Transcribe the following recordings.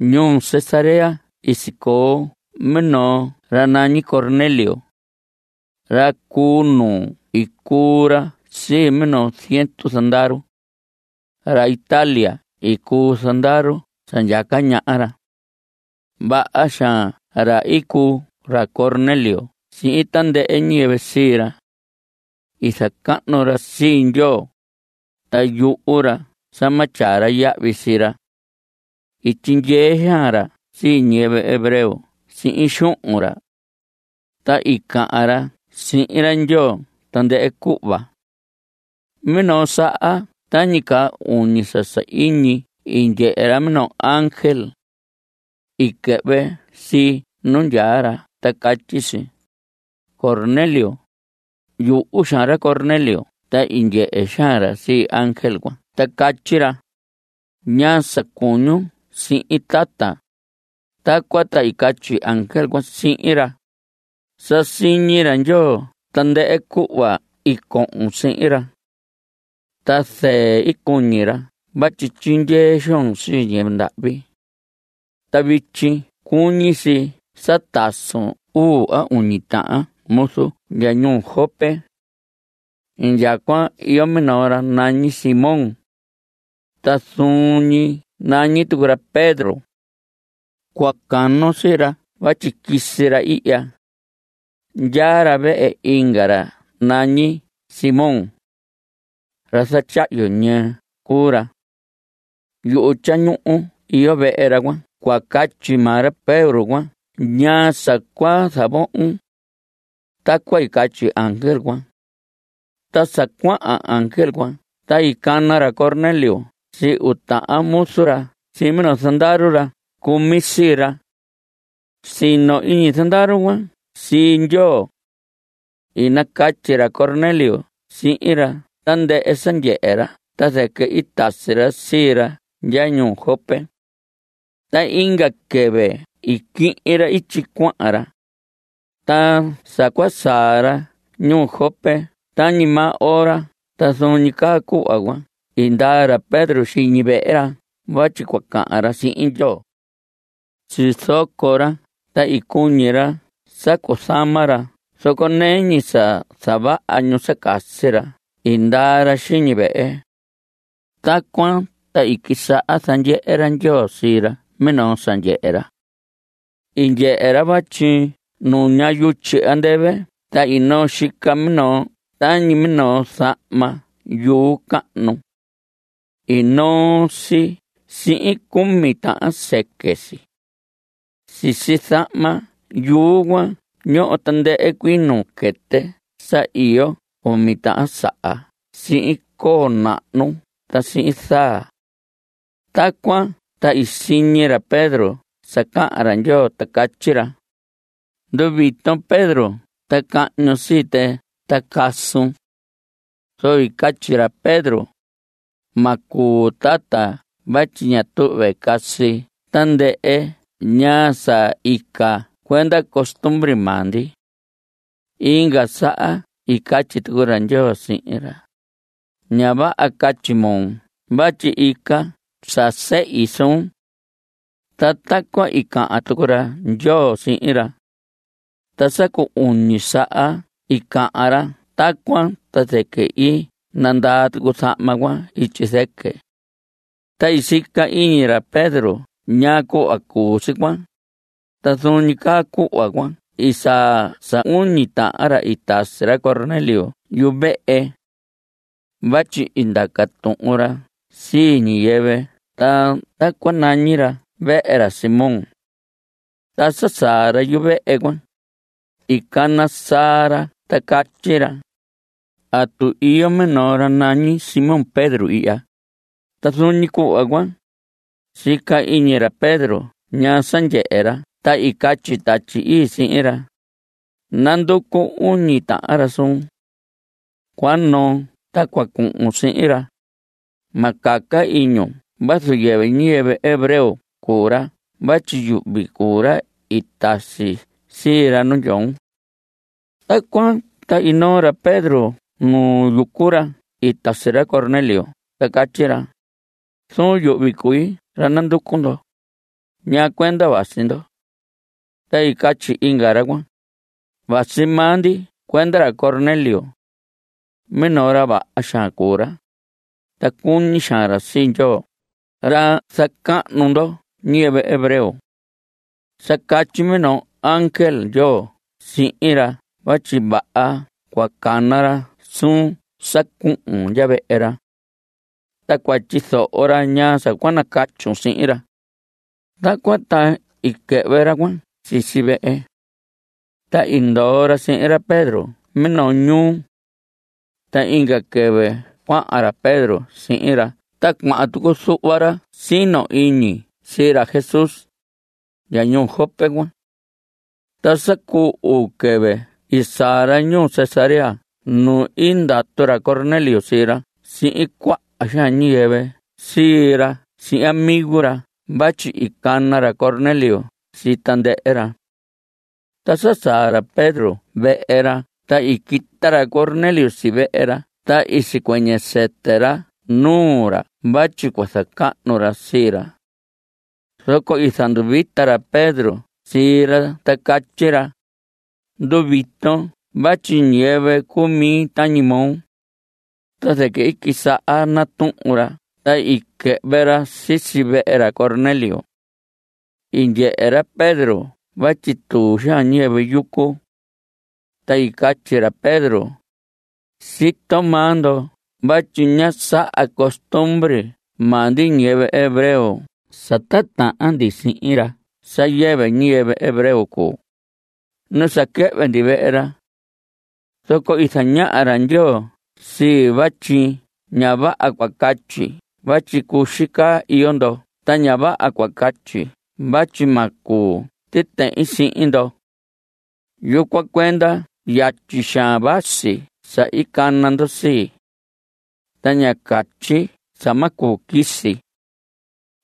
Ñuu Cesarea i sicoo minoo ra nañi Cornelio. Ra cu nuu i cuu ra sii minoo ziendu zandaru. Ra Italia i cuu zandaru sa ndyaca ñaha ra. Vaha xaan ra i cuu ra Cornelio sihin tandɨhɨ ñiyɨvɨ sii ra. I zacahnu ra sii Ndyoo, ta yuhu ra sa ma tyaa ra yahvi sii ra. I tyindyee xaan ra sii ñiyɨvɨ hebreo sihin xuhun ra. Ta i cahan ra sihin ra Ndyoo tandɨhɨ cuhva. Minoo saha tañi caa uñi sa sahiñi i ndyehe ra minoo ángel. I quɨhvɨ si nu ndyaa ra ta catyi si: ¡Cornelio! Yuhu xaan ra Cornelio ta i ndyehe xaan ra sii ángel cuan ta catyi ra: ¿Ñaa sa cuñun sihin, tata? Tacuan ta i catyi ángel cuan sihin ra: Sa siñi ra Ndyoo tandɨhɨ cuhva i cohon sihin ra. Ta zɨɨ cuñi ra vatyi tyindyee xoon sii ñiyɨvɨ ndahvi. Ta vityi cuñi si sa tasun uu a uñi tahan muzun ndya ñuu Jope. Indyacuan iyo minoo ra nañi Simón. Ta zuun ñi nañi tucu ra Pedro. Cua canon sii ra vatyi quisi ra ihya. Ndyaa ra vehe inga ra nañi Simón. Ra zatyahyu ñɨɨ cuu ra. Yuhu tyañuhu iyo vehe ra. Cua catyi maa ra Pedro cuan ñaa sa cua zavohon. Tacuan i catyi ángel cuan. Ta sa cuahan ángel cuan ta i cana ra Cornelio sii uu tahan muzu ra sihin minoo zandaru ra cumi sii ra. Sino iñi zandaru cuan sii Ndyoo. I nacatyi ra Cornelio sihin ra tandɨhɨ sa ndyehe ra ta zɨquɨ i tasi ra sii ra ndya ñuu Jope. Ta inga quɨvɨ i quihin ra ityi cuahan ra. Ta sa cua saa ra ñuu Jope tañi maa ora ta zuun ñi caa cuhva cuan i ndaa ra Pedro xiñi vehe ra vatyi cua cahan ra sihin Ndyoo. Sizoco ra ta cuñi ra sa cuzama ra zoco nɨɨ ñi sa zavaha ñu sa casi ra i ndaa ra xiñi vehe. Tacuan ta i quisaha zandyehe ra Ndyoo sii ra minoo sa ndyehe ra. I ndyehe ra vatyi nuña yutyi andɨvɨ ta i noo xica minoo tañi minoo zahma yuu cahnu. I noo si sihin cumi tahan sɨquɨ si. Sisi zahma yuu cuan ñoho tandɨhɨ cuii nuu quɨtɨ sa iyo cumi tahan saha sihin coo nahnu ta sihin zaa. Tacuan ta i siñi ra Pedro sa cahan ra Ndyoo ta catyi ra: Nduviton Pedro ta cahñun sii tɨ ta casun. Zoco i catyi ra Pedro: Ma cuu tata vatyi ña tuhve casi tandɨhɨ ñaa sa ica cuenda costumbre maa ndi. Inga saha i catyi tucu ra Ndyoo sihin ra: Ña vaha catyi moo vatyi ica sa sehi suun. Ta tacuan i cahan tucu ra Ndyoo sihin ra. Ta sa cu uñi saha i cahan ra tacuan ta zɨquɨ i nandaa tucu zahma cuan ityi zɨquɨ. Ta i sica iñi ra Pedro ñaa cuhva cuu si cuan, ta zuun ñi caa cuhva cuan i saa sa uñi tahan ra i tasi ra Cornelio yuvehe. Vatyi i ndaca tuhun ra sii ñiyɨvɨ ta tacuan i nañihi ra vehe ra Simón. Ta sa saa ra yuvehe cuan, i cana saa ra ta catyi ra: ¿Atu iyo minoo ra nañi Simón Pedro ihya? Ta zuun ñi cuhva cuan, sica iñi ra Pedro ñaa sa ndyehe ra ta i catyi Tatyi Ii sihin ra: Nanducu uñi tahan ra suun. Cua noon ta cua cuhun sihin ra. Ma caca iñun vazu yɨvɨ ñiyɨvɨ hebreo cuu ra vatyi yuhvi cuu ra i tasi sii ra nu ndyoon. Tacuan ta i noo ra Pedro nu yucu ra i tasi ra Cornelio ta catyi ra: Zuun yuhvi cui ra nanducu ndo. ¿Ñaa cuenda vasi ndo? Ta i catyi inga ra cuan: Vasi maa ndi cuenda ra Cornelio. Minoo ra vaha xaan cuu ra. Ta cuñi xaan ra sii Ndyoo ra zacahnu ndoho ñiyɨvɨ hebreo. Sa catyi minoo ángel Ndyoo sihin ra vatyi vaha cua cana ra suun sa cuhun ndya vehe ra. Ta cua tyizoho ra ñaa sa cua nacatyun sihin ra. Tacuan ta i quɨhvɨ ra cuan sisi vehe. Ta i ndoo ra sihin ra Pedro minoo ñuu. Ta inga quɨvɨ cuahan ra Pedro sihin ra ta cuahan tucu zuhva ra sino iñi sii ra Jesús, ra ñuu Jope cuan. Ta sa cu uu quɨvɨ i saa ra ñuu Cesarea nu i ndatu ra Cornelio sii ra sihin cuaha xaan ñiyɨvɨ sii ra sihin amigo ra vatyi i cana ra Cornelio sii tandɨhɨ ra. Ta sa saa ra Pedro vehe ra ta i quita ra Cornelio si vehe ra ta i sicuɨñɨ sɨtɨ ra nuu ra vatyi cua zacahnu ra sii ra. Zoco i zanduvita ra Pedro sii ra ta catyi ra: Nduviton vatyi ñiyɨvɨ cuu mi tañi moo. Ta zɨquɨ i quisaha natuhun ra ta i quɨhvɨ ra sisi vehe ra Cornelio. I ndyehe ra Pedro vatyi tuu xaan ñiyɨvɨ yucu. Ta i catyi ra Pedro: Sito maa ndo vatyi ña saha costumbre maa ndi ñiyɨvɨ hebreo sa titahan ndi sihin ra sa yɨvɨ ñiyɨvɨ hebreo cuu, nu sa quɨhvɨ ndi vehe ra. Zoco i zañaha ra Ndyoo sii vatyi ña vaha cua catyi vatyi cuxi caa iyo ndo ta ña vaha cua catyi vatyi ma cuu titehin sihin ndo. Yucuan cuenda yatyi xaan vasi sa i cana ndo sii. Ta ñá catyi sa ma cuu quisi.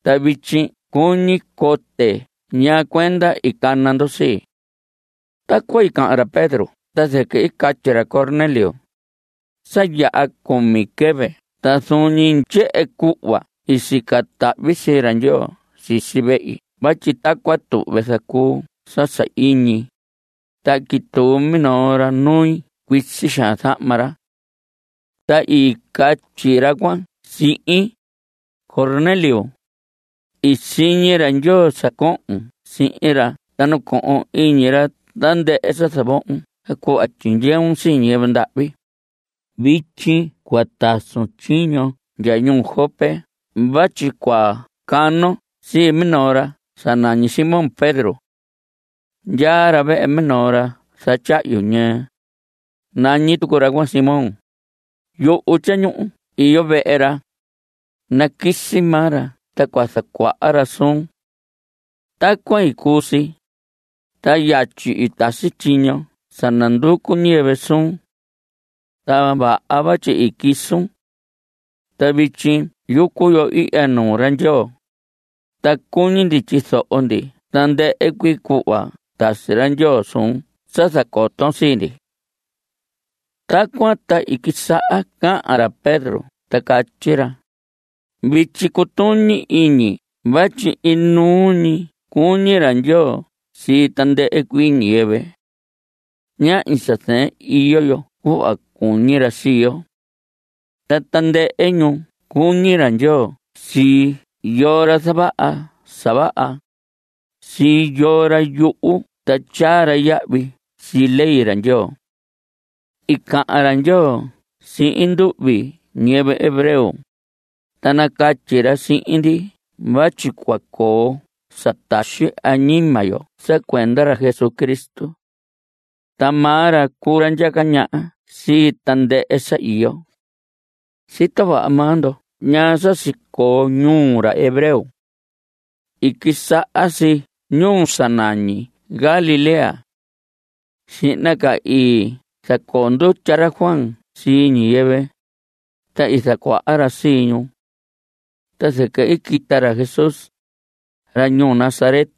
Ta vityi cuñi cote ¿ñaa cuenda i cana ndo sii? Tacuan i cahan ra Pedro ta zɨquɨ i catyi ra Cornelio: Sa yaha cumi quɨvɨ ta zuun ñi tyehen cuhva i sica tahvi sii ra Ndyoo sisi vehi vatyi tacuan tuhve zacuu sa sahiñi, ta i quituu minoo ra nui. Cuisi xaan zahma ra. Ta i catyi ra cuan sihin: “Cornelio, i siñi ra Ndyoo sa cohon sihin ra ta nacohon iñi ra tandɨhɨ sa zavohon ta cuhva tyindyeun sii ñiyɨvɨ ndahvi. Vityi cua tasun tyiño ndya ñuu Jope vatyi cua canon sii minoo ra sa nañi Simón Pedro. Ndyaa ra vehe minoo ra zatyahyu ñɨɨ. Nañi tucu ra cuan Simón. Yuhu tyañuhu iyo vehe ra. Naquisi maa ra ta cua zacuaha ra suun.” Tacuan i cuu si, ta yatyi i tasi tyiño sa nanducu ñiyɨvɨ suun. Ta vaha vatyi i quisun. Ta vityi yucu yo ihya nuu ra Ndyoo, ta cuñi ndi tyizoho ndi tandɨhɨ cuii cuhva tasi ra Ndyoo suun sa zacoton sii ndi. Tacuan ta i quisaha cahan ra Pedro ta catyi ra: Vityi cutuñi iñi vatyi inuu ñi cuñi ra Ndyoo sii tandɨhɨ cuii ñiyɨvɨ. Ñahñi sa zɨɨn iyo yo cuhva cuñi ra sii yo. Ta tandɨhɨ ñuu cuñi ra Ndyoo sii yoo ra zavaha sa vaha, sii yoo ra yuhu ta tyaa ra yahvi sii ley ra Ndyoo. I cahan ra Ndyoo sihin nduhvi ñiyɨvɨ hebreo, ta nacatyi ra sihin ndi vatyi cua coo sa taxi ñi añima yo sa cuenda ra Jesucristo. Ta maa ra cuu ra ndyaca ñaha sii tandɨhɨ sa iyo. Sito vaha maa ndo ñaa sa sicoo ñuu ra hebreo. I quisaha si ñuu sa nañi Galilea. Xihna ca i zacoo ndutya ra Juan sii ñiyɨvɨ, ta i zacuaha ra sii ñu. Ta zɨquɨ i quita ra Jesús, ra ñuu Nazaret,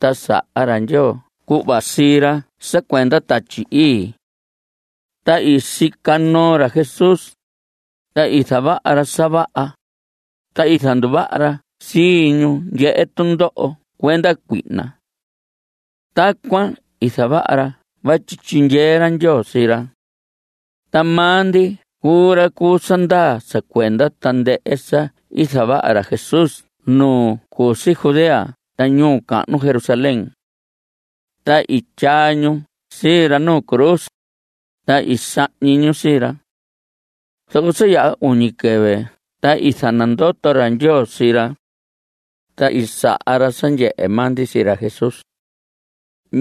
ta saha ra Ndyoo cuhva sii ra sa cuenda Tatyi Ii. Ta i sica noo ra Jesús, ta i zavaha ra sa vaha, ta i zanduvaha ra sii ñu ndyehe tundoho cuenda cuihna. Tacuan i zavaha ra vatyi i tyindyee ra Ndyoo sii ra. Ta maa ndi cuu ra cu sa ndaa sa cuenda tandɨhɨ sa i zavaha ra Jesús nu cu si Judea ta ñuu cahnu Jerusalén. Ta i tyaa ñu sii ra nu cruz, ta i sahñi ñu sii ra. Zoco sa yaha uñi quɨvɨ ta i zanandoto ra Ndyoo sii ra. Ta i saha ra sa ndyehe maa ndi sii ra Jesús.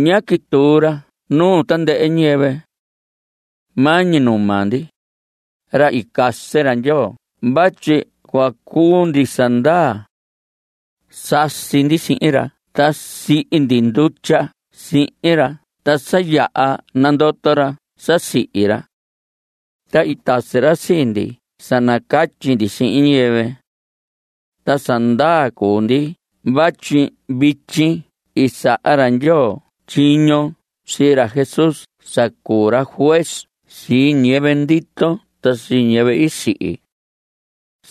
Ñá quituu ra nuu tandɨhɨ ñiyɨvɨ. Maa ñi nuu maa ndi, ra i casi ra Ndyoo vatyi cua cuu ndi sa ndaa. Sasi ndi sihin ra ta sihi ndi ndutya sihin ra ta sa yaha nandoto ra sa sihi ra. Ta i tasi ra sii ndi sa nacatyi ndi sihin ñiyɨvɨ. Ta sa ndaa cuu ndi vatyi vityi i saha ra Ndyoo tyiño sii ra Jesús sa cuu ra juez sii ñiyɨvɨ ndito ta sii ñiyɨvɨ i sihi.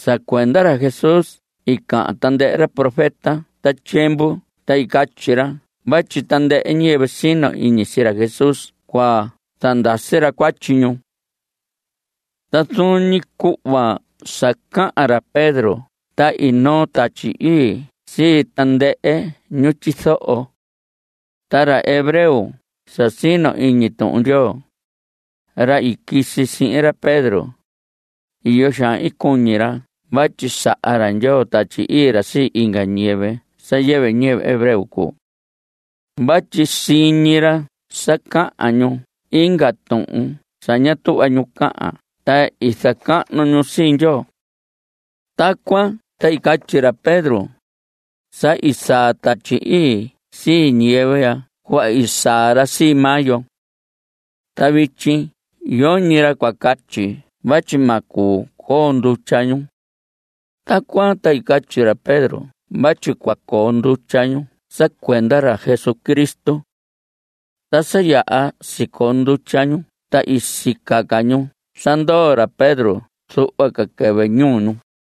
Sa cuenda ra Jesús i cahan tandɨhɨ ra profeta ta tyiemvu ta catyi ra vatyi tandɨhɨ ñiyɨvɨ sino iñi sii ra Jesús cua zandasi ra cuatyi ñu. Ta zuun ñi cuhva sa cahan ra Pedro ta i noo Tatyi Ii sii tandɨhɨ ñu tyizoho. Ta ra hebreo sa sino iñi Tuhun Ndyoo, ra i quisi sihin ra Pedro, iyo xaan i cuñi ra vatyi saha ra Ndyoo Tatyi Ii ra sii inga ñiyɨvɨ sa yɨvɨ ñiyɨvɨ hebreo cuu. Vatyi siñi ra sa cahan ñu inga tuhun sa ña tuhva ñu cahan ta zacahnu ñu sii Ndyoo. Tacuan ta i catyi ra Pedro: Sa i saa Tatyi Ii sii ñiyɨvɨ ya cuhva i saa ra sii maa yo. Ta vityi yoñi ra cua catyi vatyi ma cuu coo ndutya ñu. Tacuan, ta i catyi ra Pedro vatyi cua coo ndutya ñu sa cuenda ra Jesucristo. Ta sa yaha sicoo ndutya ñu ta i sica ca ñu sa ndoo ra Pedro zuhva ca quɨvɨ ñuu ñu.